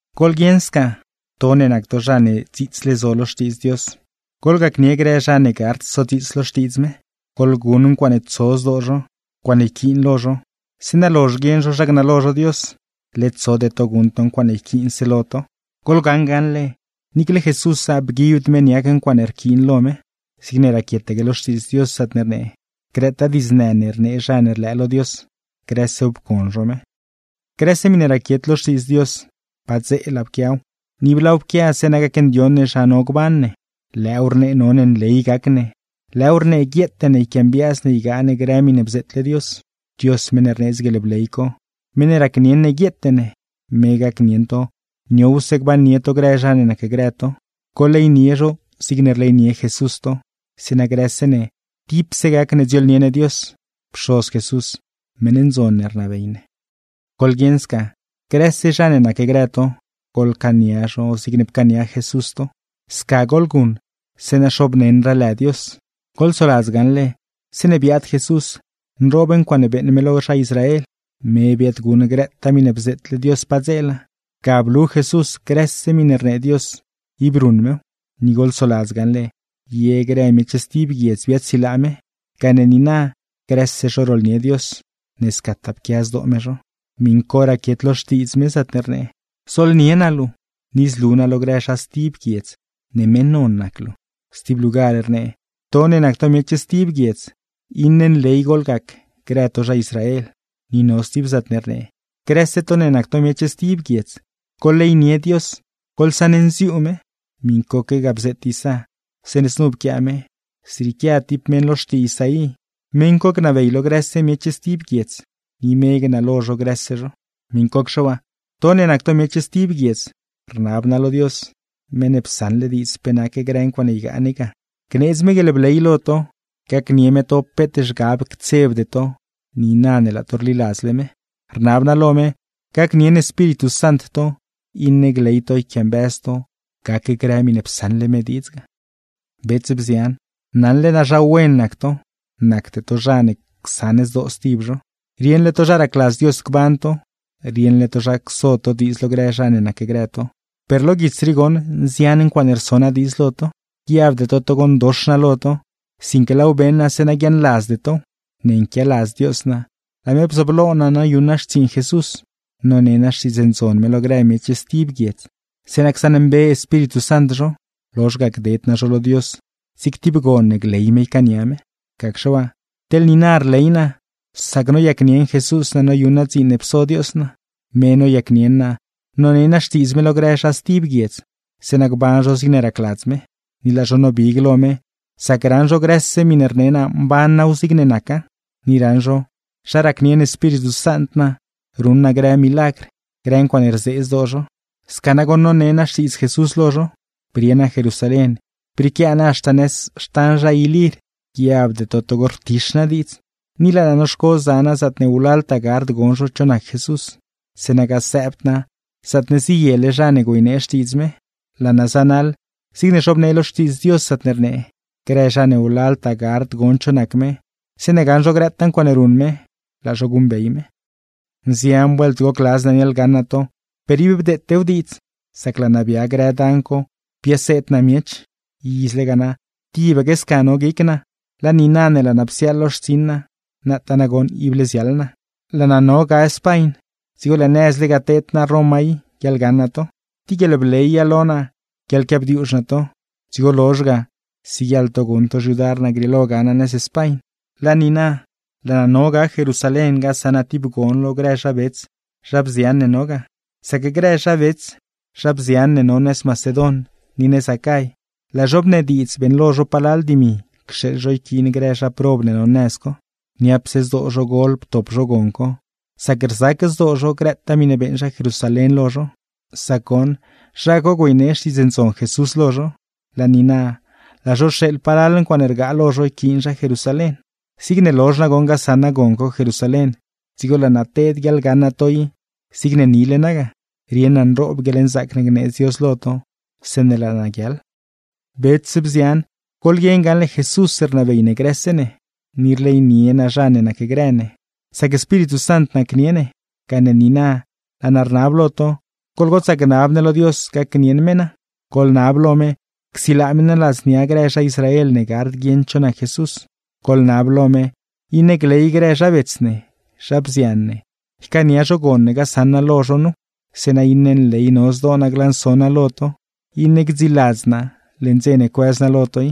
Goḻguieṉ sca, to ne nac to zha ne dziitsle zo lo Xtiidz Dios, goḻgacnie grë zha ne gard sodziits lo Xtiidz me. Goḻguṉ ncuaaṉe tso zdoo zho, ncuaaṉe yquiin lo zho, zeeṉa lozh guieṉ zho zha gnalo zho Dios; led tsode to guṉ to ncuaaṉe yquiinse lo to. Goḻgaṉ gaṉle, niicle Jesúsa bguibd me niac ncuaaṉe nquiin lo me. Zigne raquietaque lo Xtiidz Dios, zaatne rnee: “Grëtaa diidznë ne rnee zha ne rlëë lo Dios, grësew pcon zho me.” Grëse miṉe raquiet lo Xtiidz Dios, padzeela pquiaw; ni ib laaw pquia zeeṉa gacndioṉ ne zha no gban ne. Lëëw rnee none nley gac ne, lëëw rnee guieete ne yquiambiaaz ne ygaa ne grë miṉe bzeetle Dios. Dios meṉ ne rneedz guieḻbley co, meṉ ne racnieṉ ne guieete ne, me gacnieṉ to niowse gbannie to grë zha ne nacgrë to. Goḻleynie zho zigne rleynie Jesús to, zeeṉa grëse ne tipse gac ne dziooḻnie ne Dios, Pxoz Jesús, meṉ ndzon ne rnabey ne. Goḻguieṉ sca, grëse zha ne nacgrë to, goḻcaania zho zigne pcaania Jesús to. Sca goḻguṉ, zeeṉa xoobneṉraa lë Dios. Goḻsoladz gaṉle, zeeṉe biaad Jesús nroob ncuaaṉe beeṉ me lo zha Israel, me biaadguṉ grëtaa miṉe bzeetle Dios padzeela. Ga blu Jesús grëse miṉe rnee Dios, ib ruṉ mew. Ni goḻsoladz gaṉle, ye grë miech stib guiedz biaadsilaa me, gane niina grëse zho rooḻnie Dios, ne scataa pquia zdoo me zho. Miṉ co raquiet lo Xtiidz me, zaatne rnee: Zooḻnie naa luu, ni zlu naa lo grë zha stib guiedz ne meṉ non nac luu. Stib lugar rnee: To ne nac to miech stib guiedz, ¡iṉe nley goḻgac grë to zha Israel! Ni no stib zaatne rnee: Grëse to ne nac to miech stib guiedz, ¡goḻleynie Dios! ¡Goḻsaṉnziuu lë me! Miṉcoque ga bzeet Isá, zeeṉe znu pquiaa me: Zrieequia tib meṉ lo xtii Isaí; meṉ co gnabey lo grëse miech stib guiedz, ni me gnalo zho grëse zho. Miṉcocxe waa, to ne nac to miech stib guiedz, rnab naa lo Dios (meṉ ne psaṉle diidz pe nac grë ncuaaṉe ygaa ne ga) gneedz me guieḻbley lo to, gacnie me to peet zhgab ctsebde to niina ne laa to rliladzle me. Rnab naa lo me, gacnieṉ Espíritu Sant to iṉe gley to yquiambëz to gac grë miṉe psaṉle me diidz ga. Bets, bzian, naṉle naa zha wen nac to, nacde to zha ne csaṉ zdoo stib zho; rieṉle to zha racladz Dios gban to, rieṉle to zha cso to diidz lo grë zha ne nacgrë to; per lo guits rii goṉ nzian ncuaaṉe rso naa diidz lo to. Guiabde to togo ndox naa lo to, sinque laaw beṉ naa zeeṉa guiaaṉladzde tow. Ne nquialadz Dios naa, laa me bzooblo naa noyuṉ naa xtsiiṉ Jesús, none naa Xtiidz Ndzon me lo grë miech stib guiedz, zeeṉa csaṉmbe Espíritu Sant zho; lozh ga gded naa zho lo Dios zig tib gon ne gley me ycaania me. Gacxe waa, teḻ niina rley naa sac noyacnieṉ Jesús naa noyuṉ naa dziin ne pso Dios naa. Me noyacnieṉ naa none naa Xtiidz me lo grë zha stib guiedz, zeeṉa gban zho zigne racladz me. Ni laa zho nobig lo me, sac raṉ zho grëse miṉe rne naa mban naaw zigne naca, ni raṉ zho zha racnieṉ Espíritu Sant naa ruṉ naa grë milagr, grë ncuaaṉe rzee zdoo zho. Sca nagoṉ none naa Xtiidz Jesús lo zho, brie naa Jerusalén brieequia naa haxta nëz xtan zha Ilir. Guiabde to togo rtix naa diidz. Ni laa naa noxco za naa zaatne wlaltaa gard gon zho cho nac Jesús, zeeṉa gasëëbd naa zaatne ziyele zha ne güeynee Xtiidz me. Laa naa zanaḻ zigne zhobnee lo Xtiidz Dios, zaatne rnee: “Grë zha ne wlaltaa gard gon cho nac me, zeeṉe gaṉ zho grëtaa ncuaaṉe ruṉ me, laa zho guṉbey me.” Nzian vuelt gocladz naa niaḻgaṉ naa to, per ib bdeetew diidz, sac laa naa bia grë dan co biaseed naa miech. Izle ga na tibaque sca no guic naa, laa niina ne laa naa psiaaḻ lo xtsiṉ naa, nataa nagoṉ ible ziaḻ naa. Laa naa no ga Spañ, dzigo lëë nëzle ga teed naa Roma i guiaḻgaṉ naa to. Tib guieḻbleya lo naa guiaḻquiabdiuuzh naa to, dzigo lozh ga siguieḻ to guṉ to xyudar naa grieelo ga naa nëz Spañ. Laa niina, laa naa no ga Jerusalén gasaṉ naa tib gon lo grë zha bets, zha bzian ne no ga; sac grë zha bets, zha bzian, ne no nëz Macedon, ni nëz Acay, laa zho bnediidz beeṉlo zho palal dimi cxeeḻ zho yquiin grë zha prob ne no nëz co. Niapse zdoo zho gol ptop zho gon co, sac rzac zdoo zho grëtaa miṉe beeṉ zha Jerusalén lo zho; sac goṉ, zha co güeynee Xtiidz Ndzon Jesús lo zho. Laa niina, laa zho rxeeḻ palal ncuaaṉe rgaa lo zho yquiin zha Jerusalén. Zigne lozh nagoṉ gasaṉ naa gon co Jerusalén, dzigo laa naa teed guiaḻgaṉ naa to i zigne nile naa ga. Rieṉ naa nroob guieḻnzaac ne gneedz Dios lo to zeeṉe laa naa guiaḻ. Bets, bzian, goḻguieṉ gaṉle Jesús rnabey ne grë ne; ni rleynie ne zha ne nacgrë ne, sac Espíritu Sant nacnie ne. Gane niina, laa naa rnab lo to, goḻgotsaa gnab ne lo Dios gacnieṉ me naa; goḻnab lo me, csilaa me naa ladznia grë zha Israel ne gard guieṉ cho nac Jesús. Goḻnab lo me, iṉe gley grë zha bets ne, zha bzian ne, ycaania zho gon ne gasaṉ naa lo zho nu; zeeṉa iṉe nley no zdoo naa glanso naa lo to, iṉe gdziiladz naa leṉ dze ne cuëz naa lo to i.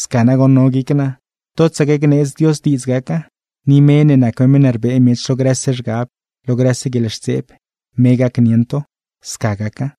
Sca nagoṉ no guic naa, totsaque gneedz Dios diidz gaca. Ni me ne nac me meṉ ne rbee miech lo grëse zhgab, lo grëse guieḻxtseeb, me gacnieṉ to. Sca gaca.